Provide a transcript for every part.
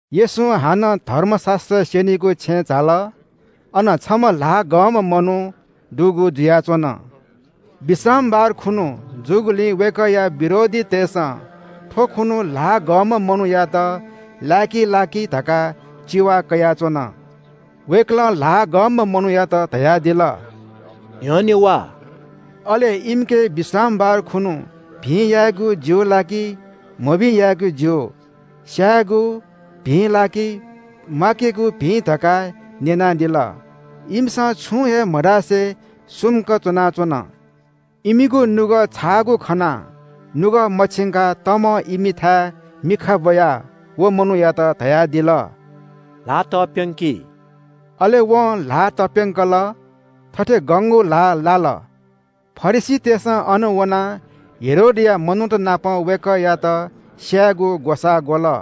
येशू हानं धर्मशास्‍त्र स्‍यनीगु छेँय् झाल। अन छम्‍ह ल्‍हाः गंम्‍ह मनू दुगु जुयाच्‍वन। विश्रामबार खुन्‍हु जूगुलिं वय्‌कःया विरोधीतय्‌सं थ्‍वखुन्‍हु ल्‍हाः गंम्‍ह मनूयात लाय्‌की ला कि धकाः चिवा कयाच्‍वन। वय्‌कलं ल्‍हाः गंम्‍ह मनूयात धयादिल – “न्‍ह्यःने वा।” वय्‌कलं इमिके थथे धकाः न्‍यनादिल, “विश्रामबार खुन्‍हु भिं यायेगु ज्‍यू ला कि मभिं यायेगु ज्‍यू, स्‍यायेगु भिं ला कि म्‍वाकेगु भिं?” तर इपिं छुं हे मधासे सुम्‍क च्‍वनाच्‍वन। इमिगु नुगः छाःगु खनाः नुगः मछिंकाः तमं इमिथाय् मिखा ब्‍वयाः व मनूयात धयादिल – “ल्‍हाः तप्‍यंकी।” अले वं ल्‍हाः तप्‍यंकल। थथे गंगु ल्‍हाः लाल। फरिसीतय्‌सं अनं वनाः हेरोदया मनूत नाप वय्‌कःयात स्‍यायेगु ग्‍वसाः ग्‍वल।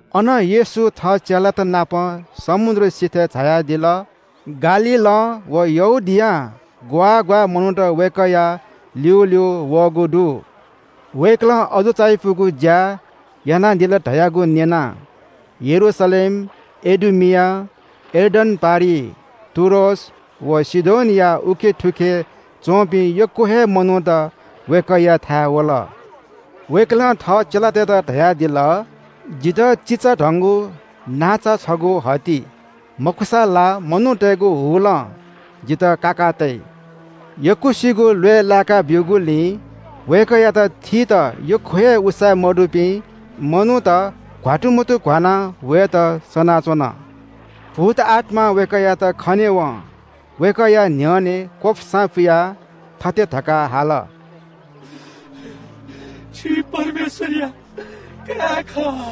अनं येशू थः चेलात नाप समुद्र सिथय् झायादिल। गालीलं व यहूदियां ग्‍वाः ग्‍वाः मनूत वय्‌कःया ल्‍यूल्‍यू वःगु दु। वय्‌कलं अजू चायापुगु ज्‍या यानादिल धयागु न्‍यनाः यरूशलेम, इदुमिया, यर्दन पारिइ, टुरोस व सीदोनया थुखे उखे च्‍वंपिं यक्‍व हे मनूत वय्‌कःयाथाय् वल। वय्‌कलं थः चेलातय्‌त धयादिल – “जितः चिचाधंगु नांचा छगू हति, मखुसा ला मनूतय्‌गु हुलं जितः काकातइ।” यक्‍वसिगु ल्‍वय् लाय्‌का ब्‍यूगुलिं वय्‌कःयात थीत यक्‍व हे उसाँय्‌मदुपिं मनूत घ्‍वात्तुमतुघ्‍वानाः वयेत सनाच्‍वन। भूतआत्‍मां वय्‌कःयात खनेवं वय्‌कःया न्‍ह्यःने क्‍वपुसां पुयाः थथे धकाः हाल – “छि परमेश्‍वरया काय् खः।”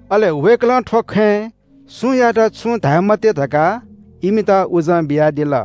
अले वय्‌कलं थ्‍व खँय् सुयातं छुं धाये मते धकाः इमित उजं बियादिल।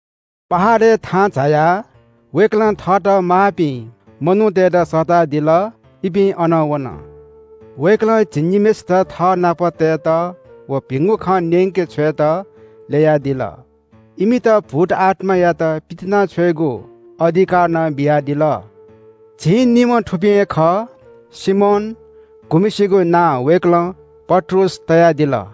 पहाडय् थाहां झायाः वय्‌कलं थःत माःपिं मनूतय्‌त सःतादिल। इपिं अन वन। वय्‌कलं झिंनिम्‍हय्‌सित थःनाप तयेत व भिंगु खँ न्‍यंके छ्वयेत ल्‍ययादिल। इमित भूतआत्‍मायात पितिनाछ्वयेगु अधिकार नं बियादिल। झिंनिम्‍ह थुपिं हे खः – सिमोन, गुम्‍हय्‌सिगु नां वय्‌कलं पत्रुस तयादिल,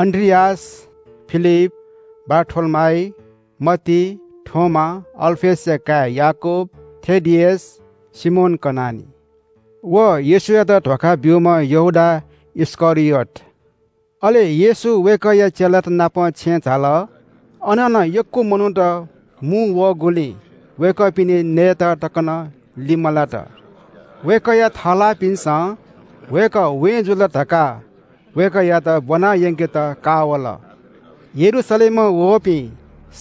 अन्‍द्रियास, फिलिप, बारथोलोमाइ, मत्ती, थोमा, अल्‍फयसया काय् याकूब, थेदियस, सिमोन कनानी व येशूयात धोखा ब्‍यूम्‍ह यहूदा इस्‍करियोत। अले येशू वय्‌कःया चेलात नाप छेँय् झाल। अन नं यक्‍व मनूत मुंवःगुलिं वय्‌कःपिनि नये तक नं लिमलात। वय्‌कःया थःलाःपिन्‍सं वय्‌कः वें जुल धकाः वय्‌कःयात ब्‍वनायंकेत का वल। यरूशलेमं वःपिं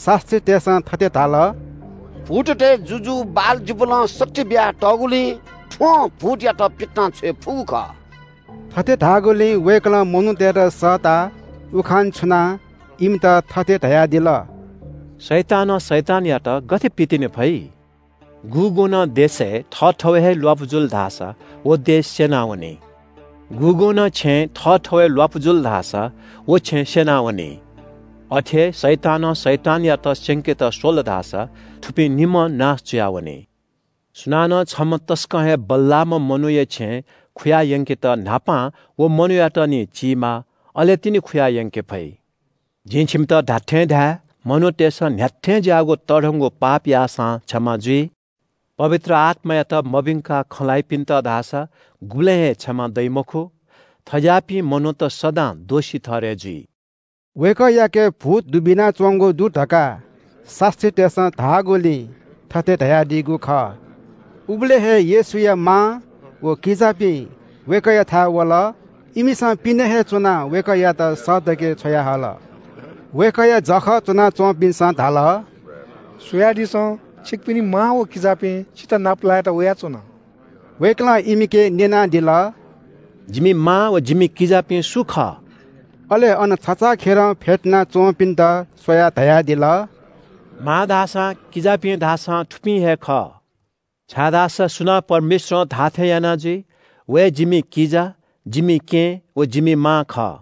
शास्‍त्रीतय्‌सं थथे धाल – “भूततय् जुजु बालजिबुलं शक्ति बियातःगुलिं थ्‍वं भूतयात पितिनाछ्वये फुगु खः।” थथे धाःगुलिं वय्‌कलं मनूतय्‌त सःता उखान छुनाः इमित थथे धयादिल – “शैतानं शैतानयात गथे पितिने फइ? गुगुं नं देशय् थःथवय् हे ल्‍वापु जुल धाःसा व देश स्‍यनावनी। गुगुं नं छेँय् थःथवय् ल्‍वापु जुल धाःसा व छेँ स्‍यनावनी। अथे हे शैतानं शैतानयात स्‍यंकेत स्‍वल धाःसा थुपिं निम्‍हं नाश जुयावनी। सुनानं छम्‍ह तसकं हे बल्‍लाःम्‍ह मनूया छेँय् खुयायंकेत न्‍हापां व मनूयात निं चीमाः, अले तिनि खुयायंके फइ। “जिं छिमित धात्‍थें धाये – मनूतय्‌सं न्‍ह्याथें ज्‍याःगु तःधंगु पाप याःसां क्षमा जुइ, पवित्र आत्‍मायात मभिंकाः खँ ल्‍हाइपिन्‍त धाःसा गुबलें हे क्षमा दइ मखु। थज्‍याःपिं मनूत सदां दोषी ठहरय् जुइ।” वय्‌कःयाके भूत दुबिनाच्‍वंगु दु धकाः शास्‍त्रीतय्‌सं धाःगुलिं थथे धयादीगु खः। उबलय् हे येशूया मां व किजापिं वय्‌कःयाथाय् वल। इमिसं पिने हे च्‍वनाः वय्‌कःयात सःतके छ्वयाहल। वय्‌कःया जःखः च्‍वनाच्‍वंपिन्‍सं धाल – “स्‍वयादिसँ, छिकपिनि मां व किजापिं छितः नापलायेत वयाच्‍वन।” वय्‌कलं इमिके न्‍यनादिल – “जिमि मां व जिमि किजापिं सु खः?” अले अन छचाःखेलं फ्‍यतुना च्‍वंपिन्‍त स्‍वयाः धयादिल – “मां धाःसां, किजापिं धाःसां थुपिं हे खः, छाय्‌धाःसा सुनां परमेश्‍वरं धाःथें याना जुइ, व हे जिमि किजा, जिमि केहेँ, व जिमि मां खः।”